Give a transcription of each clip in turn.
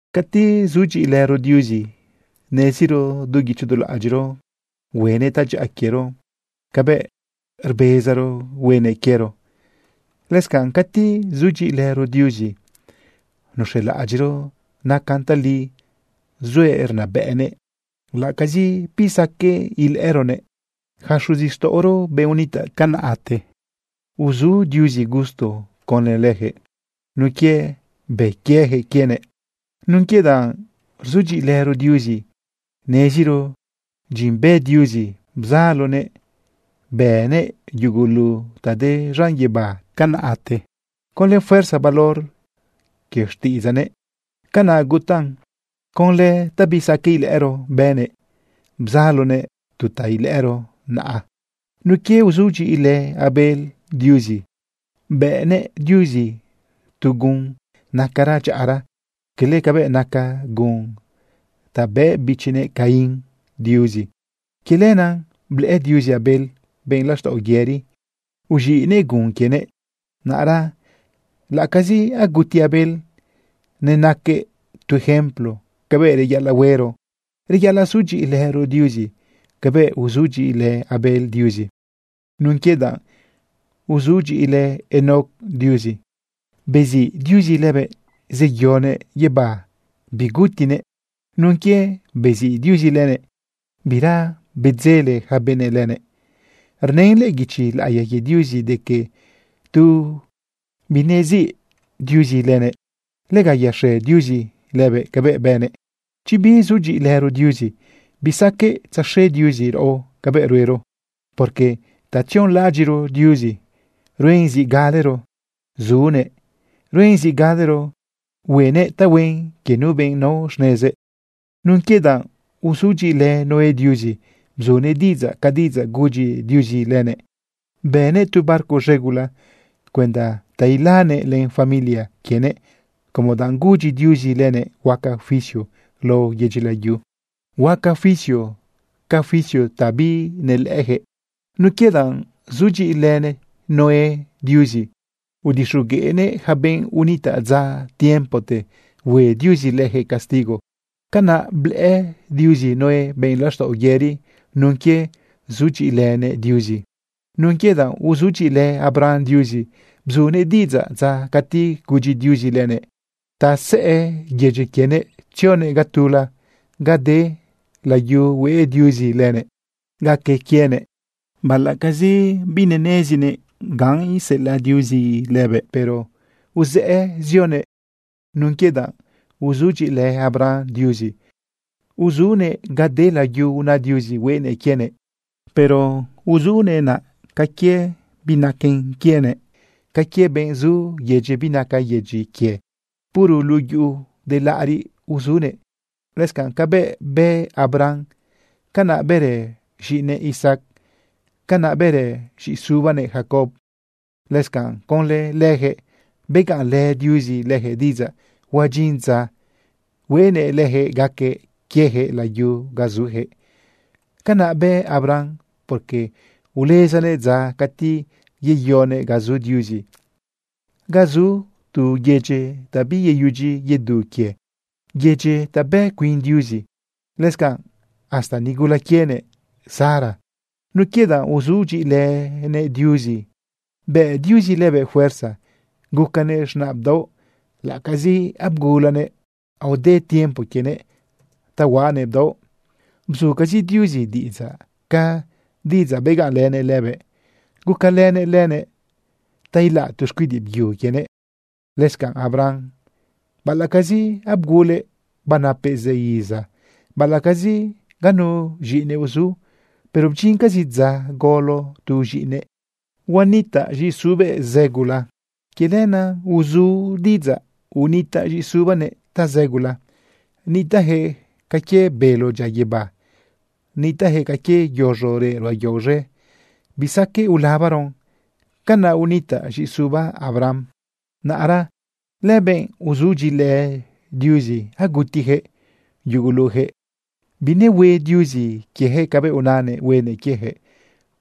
Cati sudyiꞌilëro Diuzi neziro du guicho du laꞌadyiꞌro huenëꞌ tadyaꞌa quiero cabëꞌ rbezaro huenëꞌ quiero. Lëscanꞌ cati sudyiꞌilëro Diuzi nuz̃elaꞌadyiꞌro nacan tali zuëꞌ rnabëꞌnëꞌ laꞌacazi bisaqueꞌ ilëꞌëroguëꞌ. Yaca xuzixtaꞌoro, benꞌ unitaꞌ tiempote, uzu Diuzi gusto conlë lëjëꞌ nun quie bë quieyaquëꞌ quienëꞌ. Nun quie danꞌ rzudyiꞌilëro Diuzi neziro dyin bë Diuzi bzalonëꞌ bënëꞌ yugulu ta de z̃an guibá tiempote. Conlë fuerza valor quie xtiꞌidzaꞌnëꞌ, canaꞌ gutaꞌn. Conlë ta bisaqueꞌ ilëꞌëro, bënëꞌ bzaloguëꞌ tu ta ilëꞌëro naꞌa. Nun quie uzudyiꞌilë Abel Diuzi, bëꞌnëꞌ Diuzi tu gun nacara dyaꞌara, quele cabëꞌ naca gun ta bëꞌ bichinëꞌ Caín Diuzi. Quie lenaꞌ blëꞌë Diuzi Abel benꞌ laxtaꞌo yëri, uz̃iꞌnëꞌ gun quienëꞌ. Naꞌra laꞌacazi aguti Abel, nenaquëꞌ tu ejemplo cabëꞌ reyaꞌalaꞌ huero, reyaꞌalaꞌ sudyiꞌilëro Diuzi cabëꞌ uzudyiꞌilë Abel Diuzi. Nun quie danꞌ uzudyiꞌilë Enoc Diuzi, beziꞌ Diuzi lëbëꞌ zeyoguëꞌ guibá bigutinëꞌ. Nun quie beziꞌ Diuzi lëbëꞌ, bira bedzele yaca benëꞌ lëbëꞌ. Rnën lëꞌë guichi laꞌiya quie Diuzi de que tu binesiꞌ Diuzi lëbëꞌ, lega yaxe Diuzi lëbëꞌ cabëꞌ bënëꞌ. Chi bisudyiꞌilëro Diuzi, bisaqueꞌ tzaxe Diuzi raꞌo cabëꞌ ruero, porque ta tzionlaꞌadyiꞌro Diuzi, ruen zi galero zunëꞌ, ruen zi galero huenëꞌ tahuen quie nu benꞌ nao xnezëꞌ. Nun quie danꞌ uzudyiꞌilë Noé Diuzi, bzunëꞌ diꞌidzaꞌ ca diꞌidzaꞌ gudyi Diuzi lëbëꞌ, bënëꞌ tu barco z̃e gula cuenda te ilanëꞌ len yaca familia quienëꞌ como danꞌ gudyi Diuzi lëbëꞌ huaca juicio lao yedyi layu, huaca juicio ca juicio ta binelëꞌëjëꞌ. Nun quie danꞌ uzudyiꞌilë Noé Diuzi, udixogueꞌnëꞌ yaca benꞌ unitaꞌ dza tiempote hue Diuzi lëjëꞌ castigo. Canaꞌ blëꞌë Diuzi Noé benꞌ laxtaꞌo yëri nun quie uzudyiꞌilënëꞌ Diuzi. Nun quie danꞌ uzudyiꞌilë Abraham Diuzi, bzunëꞌ diꞌidzaꞌ dza cati gudyi Diuzi lëbëꞌ ta uzëꞌë yedyi quienëꞌ zioguëꞌ ga tula ga de layu hueꞌ Diuzi lëbëꞌ gaque quienëꞌ. Baꞌalaꞌcazi binenezinëꞌ ga iseꞌelaꞌ Diuzi lëbëꞌ, pero uzëꞌë zioguëꞌ. Nun quie danꞌ uzudyiꞌilë Abraham Diuzi, uzunëꞌ ga de layu una Diuzi hueꞌnëꞌ quienëꞌ, pero uzunëꞌ naꞌ ca quie binaquen quienëꞌ, ca quie benꞌ zu yedyi binaca yedyi quie. Puro luꞌu yuꞌu de laꞌariꞌzi uzunëꞌ. Lëscanꞌ cabëꞌ bë Abraham, canaꞌ bërë z̃iꞌinëꞌ Isaac, canaꞌ bërë z̃iꞌisubanëꞌ Jacob. Lëscanꞌ conlë lëjëꞌ begaꞌnlë Diuzi lëjëꞌ diꞌidzaꞌ huadyin dza hueꞌnëꞌ lëjëꞌ gaque quiejëꞌ layu ga zujëꞌ. Canaꞌ bë Abraham, porque ulezanëꞌ dza cati yeyoguëꞌ ga zu Diuzi, ga zu tu yedyi ta biyeyudyi yedu quie, yedyi ta bë cuin Diuzi. Lëscanꞌ, hasta nigula quienëꞌ Sara, nun quie danꞌ uzudyiꞌilënëꞌ Diuzi, bëꞌ Diuzi lëbëꞌ fuerza gucanëꞌ z̃naꞌ bdaoꞌ, laꞌacazi abgulanëꞌ aode tiempo quienëꞌ ta huaꞌanëꞌ bdaoꞌ. Bzucazi Diuzi diꞌidzaꞌ ca diꞌidzaꞌ begaꞌnlënëꞌ lëbëꞌ, gucalënëꞌ lëbëꞌ ta ilaꞌ tu xcuidiꞌ byu quienëꞌ. Lëscanꞌ Abraham, baꞌalaꞌcazi abgulëꞌ banapëꞌ zë iza, baꞌalaꞌcazi ganu z̃iꞌinëꞌ uzu, pero bdyincazi dza golo tu z̃iꞌinëꞌ, biꞌ initaꞌ z̃iꞌisube zë gula. Quie lenaꞌ uzu diꞌidzaꞌ unitaꞌ z̃iꞌisubanëꞌ tazë gula. Nitaꞌjëꞌ ca quie bélo dyia guibá, nitaꞌjëꞌ ca quie yoz̃o reꞌ ruꞌa yao z̃e, bisaqueꞌ ulabaron. Canaꞌ nitaꞌ z̃iꞌisuba Abraham. Naꞌra lëbenꞌ uzudyiꞌilë Diuzi agutijëꞌ yugulujëꞌ. Binehue Diuzi quiejëꞌ cabëꞌ unanëꞌ huenëꞌ quiejëꞌ,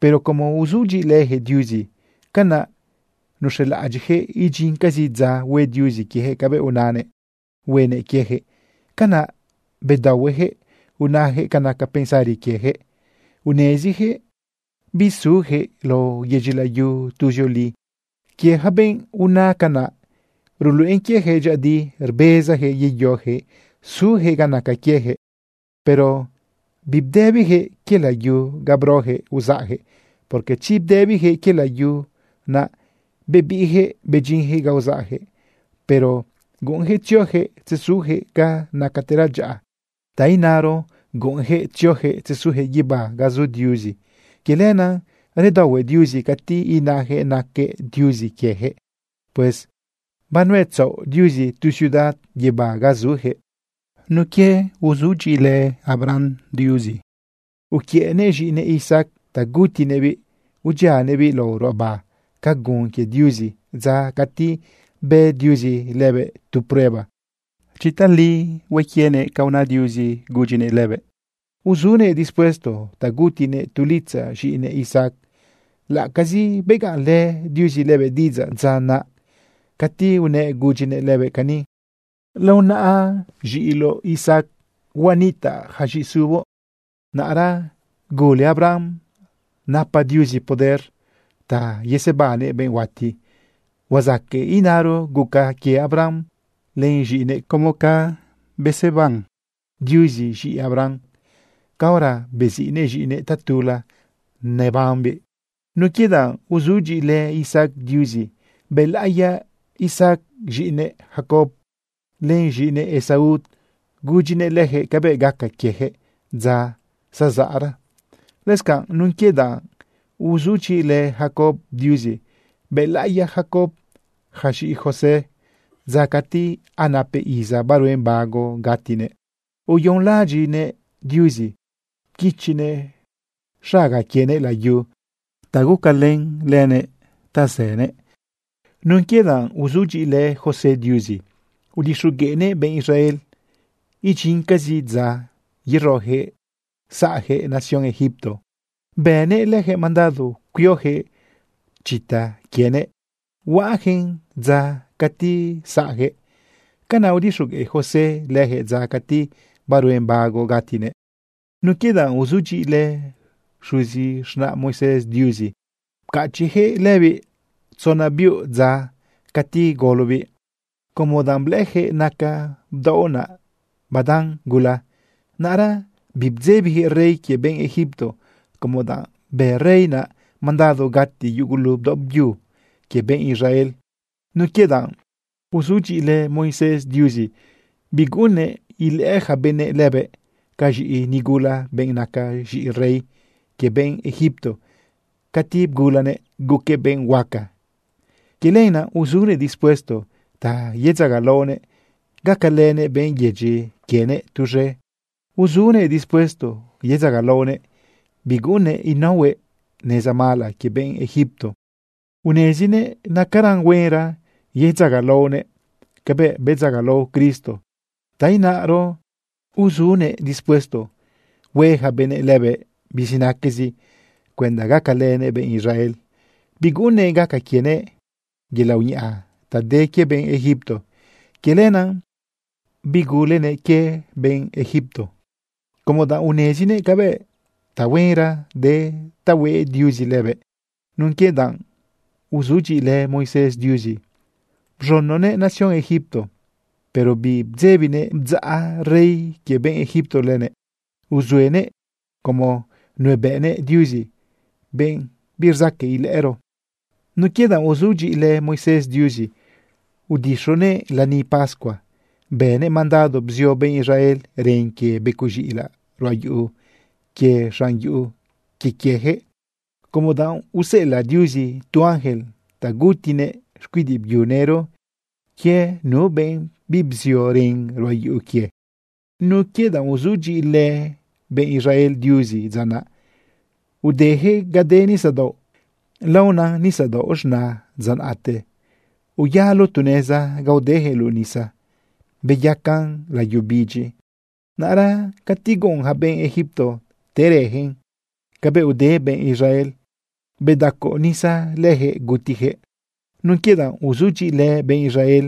pero como uzudyiꞌilëjëꞌ Diuzi, canaꞌ nuz̃elaꞌadyiꞌjëꞌ idyincazi dza hue Diuzi quiejëꞌ cabëꞌ unanëꞌ huenëꞌ quiejëꞌ. Canaꞌ bedaohuejëꞌ unajëꞌ ca naca pensari quiejëꞌ, unezijëꞌ bisujëꞌ lao yedyi layu tuzioli. Quie yaca benꞌ una canaꞌ, ruluꞌen quiejëꞌ dyëꞌëdi rbezajëꞌ yeyojëꞌ sujëꞌ ga naca quiejëꞌ. Pero bibdëbijëꞌ quie layu ga brojëꞌ uzaꞌjëꞌ, porque chi bdëbijëꞌ quie layu naꞌ, bebiꞌjëꞌ bedyinjëꞌ ga uzaꞌjëꞌ. Pero guꞌunjëꞌ tziojëꞌ tzesujëꞌ ga nacatera dyaꞌa, ta inaro guꞌunjëꞌ tziojëꞌ tzesujëꞌ guibá ga zu Diuzi. Quie lenaꞌ redaohue Diuzi cati inajëꞌ naquëꞌ Diuzi quiejëꞌ. Pues banuetzaꞌo Diuzi tu ciudad guibá ga sujëꞌ. Nun quie uzudyiꞌilë Abraham Diuzi, uquiëꞌnëꞌ z̃iꞌinëꞌ Isaac ta gutinëꞌbiꞌ udyianëꞌbiꞌ lao ruꞌaba ca gun quie Diuzi dza cati bë Diuzi lëbëꞌ tu prueba chi tali hue quienëꞌ ca una Diuzi lëbëꞌ. Uzunëꞌ dispuesto ta gutinëꞌ tu litzaꞌ z̃iꞌinëꞌ Isaac, laꞌacazi begaꞌnlë Diuzi lëbëꞌ diꞌidzaꞌ dza naꞌ cati unëꞌ gudyinëꞌ lëbëꞌ cani: “Lao naꞌa z̃iꞌiloꞌ Isaac huanitaꞌ ja z̃iꞌisuboꞌ.” Naꞌra gule Abraham napa Diuzi poder ta yesebannëꞌ benꞌ huati. Huazaqueꞌ inaro guca quie Abraham len z̃iꞌinëꞌ como si fuera beseban Diuzi z̃iꞌi Abraham caora beziꞌnëꞌ z̃iꞌinëꞌ tatula nebambiꞌ. Nun quie danꞌ uzudyiꞌilë Isaac Diuzi, bëlaꞌiya Isaac z̃iꞌinëꞌ Jacob len z̃iꞌinëꞌ Esaú gudyinëꞌ lëjëꞌ cabëꞌ gaca quiejëꞌ dza zazaꞌra. Lëscanꞌ nun quie danꞌ uzudyiꞌilë Jacob Diuzi, bëlaꞌiya Jacob ja z̃iꞌi José dza cati anapëꞌ iza baruen bago gatinëꞌ, uyonlaꞌadyiꞌnëꞌ Diuzi pquichinëꞌ xaga quienëꞌ layu ta gucalën lënëꞌ ta zënëꞌ. Nun quie danꞌ uzudyiꞌilë José Diuzi, udixogueꞌnëꞌ benꞌ Israel idyincazi dza yerojëꞌ saꞌjëꞌ nación Egipto, bënëꞌ lëjëꞌ mandado cuiojëꞌ chita quienëꞌ huaꞌajëꞌn dza cati saꞌjëꞌ. Canaꞌ udixogueꞌ José lëjëꞌ dza cati baruen bago gatinëꞌ. Nun quie danꞌ uzudyiꞌilë xuzi z̃naꞌ Moisés Diuzi, pcachiꞌjëꞌ lëbiꞌ tzona biuꞌ dza cati golobiꞌ, como danꞌ blëꞌëjëꞌ naca bdaoꞌ naꞌ badan gula. Naꞌra bibdzebijëꞌ rey quie benꞌ Egipto, como danꞌ bë rey naꞌ mandado gati yugulu bdaoꞌ byu quie benꞌ Israel. Nun quie danꞌ uzudyiꞌilë Moisés Diuzi, biguꞌunnëꞌ ilëꞌë ja benëꞌ lëbëꞌ ca z̃iꞌi nigula, benꞌ naca z̃iꞌi rey quie benꞌ Egipto cati bgulanëꞌ guquëꞌ benꞌ huaca. Quie lenaꞌ uzunëꞌ dispuesto ta yedzagalaonëꞌ gacalënëꞌ benꞌ yedyi quienëꞌ tuz̃e. Uzunëꞌ dispuesto yedzagalaonëꞌ, biguꞌunnëꞌ inaohuëꞌ neza mala quie benꞌ Egipto. Unezinëꞌ nacaran huenra yedzagalaonëꞌ cabëꞌ bedzagalao Cristo, ta inaro uzunëꞌ dispuesto hue ja benëꞌ lëbëꞌ bizinaquezi cuenda gacalënëꞌ benꞌ Israel, biguꞌunnëꞌ gaca quienëꞌ yelaꞌ uñaꞌa ta de quie benꞌ Egipto. Quie lenaꞌ bigulenëꞌ quie benꞌ Egipto, como danꞌ unezinëꞌ cabëꞌ tahuenra de ta hueꞌ Diuzi lëbëꞌ. Nun quie danꞌ uzudyiꞌilë Moisés Diuzi, bz̃unonëꞌ nación Egipto, pero bibdzebinëꞌ bdzaꞌ rey quie benꞌ Egipto lëbëꞌ. Uzuenëꞌ como nuebëꞌnëꞌ Diuzi, benꞌ birzaqueꞌ ilëꞌëro. Nun quie danꞌ uzudyiꞌilë Moisés Diuzi, udixonëꞌ lani pascua bënëꞌ mandado bzio benꞌ Israel ren quie becoꞌ z̃iꞌilaꞌ ruꞌa yuꞌu quie z̃an yuꞌu quie quiejëꞌ, como danꞌ useꞌelaꞌ Diuzi tu ángel ta gutinëꞌ xcuidiꞌ byu nëro quie nu benꞌ bibzio ren ruꞌa yuꞌu quie. Nun quie danꞌ uzudyiꞌilë benꞌ Israel Diuzi dza naꞌ, udejëꞌ ga de nisadaoꞌ laona Nisadaoꞌ Z̃na dza naꞌte. Uyalo tu neza ga udejëꞌ luꞌu nisa beyacan layu bidyi. Naꞌra cati guꞌun ja benëꞌ Egipto terëjëꞌ cabëꞌ ude benꞌ Israel, bedacoꞌ nisa lëjëꞌ gutijëꞌ. Nun quie danꞌ uzudyiꞌilë benꞌ Israel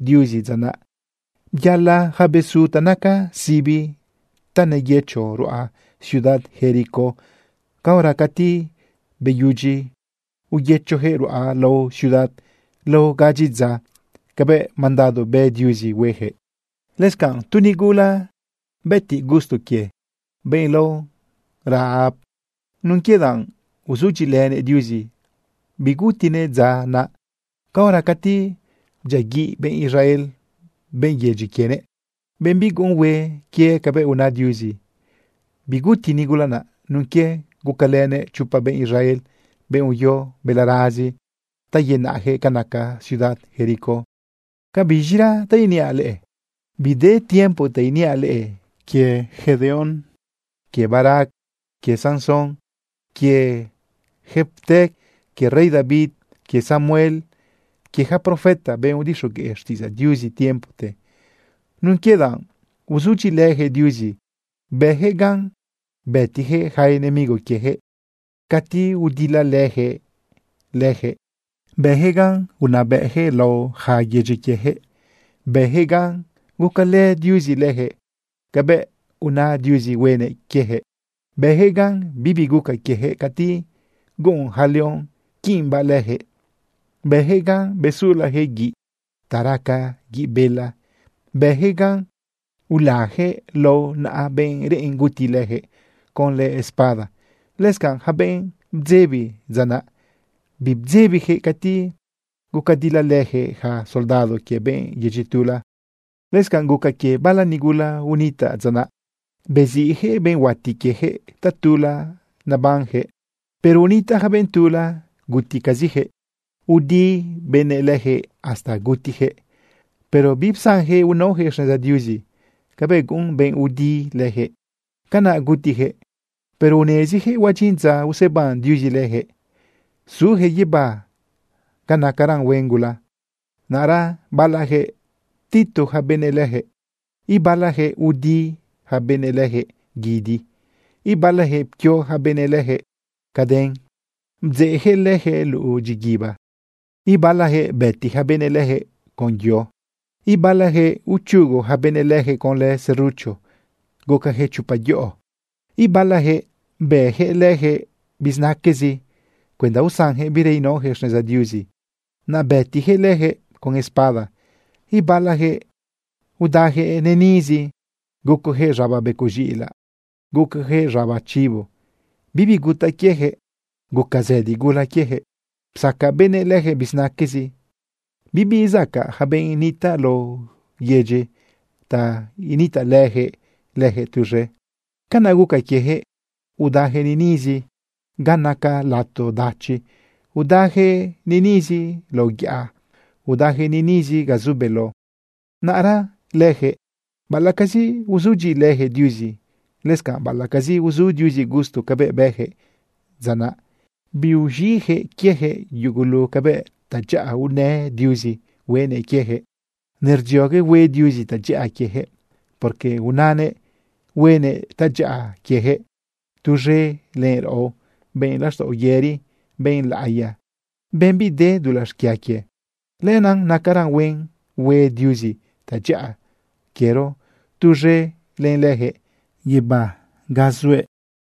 Diuzi dza naꞌ, byala ja besu ta naca sibi ta neyëcho ruꞌa ciudad Jericó caora cati beyudyi uyëchojëꞌ ruꞌa lao ciudad lao gadyi dza cabëꞌ mandado bë Diuzi huejëꞌ. Lëscanꞌ tu nigula bëtiꞌ gusto quie, benꞌ lao Rahab, nun quie danꞌ uzudyiꞌilënëꞌ Diuzi, bigutinëꞌ dza naꞌ caora cati bdyiaguiꞌ benꞌ Israel benꞌ yedyi quienëꞌ, benꞌ biguꞌun hue quie cabëꞌ una Diuzi. Biguti nigula naꞌ nun quie gucalënëꞌ chopa benꞌ Israel, benꞌ uyo balarazi ta yenaꞌjëꞌ ca naca ciudad Jericó. ¿Ca biz̃ira ta iniaꞌ leꞌe? Bide tiempo ta iniaꞌ leꞌe quie Gedeón, quie Barac, quie Sansón, quie Jefté, quie rey David, quie Samuel, quie yaca profeta, benꞌ udixogueꞌ xtiꞌidzaꞌ Diuzi tiempote. Nun quie danꞌ uzudyiꞌilëjëꞌ Diuzi, bëjëꞌ gan bëtijëꞌ yaca enemigo quiejëꞌ cati udilalëjëꞌ lëjëꞌ, bëjëꞌ gan unabëꞌjëꞌ lao ja yedyi quiejëꞌ, bëjëꞌ gan gucalë Diuzi lëjëꞌ cabëꞌ una Diuzi huenëꞌ quiejëꞌ, bëjëꞌ gan bibi guca quiejëꞌ cati guꞌun yaca león quiꞌimbaꞌ lëjëꞌ, bëjëꞌ gan besulajëꞌ guiꞌ ta raca guiꞌ bela, bëjëꞌ gan ulajëꞌ lao naꞌa benꞌ reꞌen guti lëjëꞌ conlë espada. Lëscanꞌ yaca benꞌ bdzebi dza naꞌ, bibedzebijëꞌ cati gucadilalëjëꞌ ja soldado quie benꞌ yedyi tula. Lëscanꞌ guca quie bala nigula unitaꞌ dza naꞌ beziꞌjëꞌ benꞌ huati quiejëꞌ tatula nebanjëꞌ. Pero unitaꞌ ja benꞌ tula guticazijëꞌ. Udi benëꞌ lëjëꞌ hasta gutijëꞌ, pero bipsanjëꞌ unaojëꞌ xneza Diuzi cabëꞌ guꞌun benꞌ udi lëjëꞌ. Canaꞌ gutijëꞌ, pero unezijëꞌ huadyin dza useban Diuzi lëjëꞌ sujëꞌ guibá ga nacaran huen gula. Naꞌra balajëꞌ ptitu ja benëꞌ lëjëꞌ. Ibalajëꞌ udi ja benëꞌ lëjëꞌ guidi. Ibalajëꞌ pquio ja benëꞌ lëjëꞌ caden, bdzeꞌjëꞌ lëjëꞌ luꞌu dyiguiba. Ibalajëꞌ bëti ja benëꞌ lëjëꞌ con yo. Ibalajëꞌ uchugu ja benëꞌ lëjëꞌ conlë serucho gucajëꞌ chopa yoꞌo. Ibalajëꞌ bëjëꞌ lëjëꞌ bizinaquezi cuenda usanjëꞌ bira inaojëꞌ xneza Diuzi, naꞌ bëtijëꞌ lëjëꞌ con espada. Ibalajëꞌ udajëꞌ niꞌnizi, gucojëꞌ z̃aba becoꞌ z̃iꞌilaꞌ, gucojëꞌ z̃aba chibo. Bibi gutaꞌ quiejëꞌ, guca zëdi gula quiejëꞌ. Psaca benëꞌ lëjëꞌ bizinaquezi. Bibizacaꞌ ja benꞌ nitaꞌ lao yedyi ta initaꞌlëjëꞌ lëjëꞌ tuz̃e. Canaꞌ guca quiejëꞌ udajëꞌ niꞌnizi ga naca lato dachi, udajëꞌ niꞌnizi lao yaꞌa, udajëꞌ niꞌnizi ga zu beló. Naꞌra lëjëꞌ, baꞌalaꞌcazi uzudyiꞌilëjëꞌ Diuzi, lëscanꞌ baꞌalaꞌcazi uzu Diuzi gusto cabëꞌ bëjëꞌ dza naꞌ, biuz̃iꞌjëꞌ quiejëꞌ yugulu cabëꞌ tadyaꞌa unë Diuzi hueꞌnëꞌ quiejëꞌ. Nerdziogue hue Diuzi tadyaꞌa quiejëꞌ, porque unanëꞌ huenëꞌ tadyaꞌa quiejëꞌ tuz̃e len raꞌo, benꞌ laxtaꞌo yëri, benꞌ laꞌiya, benꞌ bide dulaꞌ xquia quie. Lenaꞌ nacaran huen hue Diuzi tadyaꞌa quiero tuz̃e len lëjëꞌ guibá ga zuëꞌ.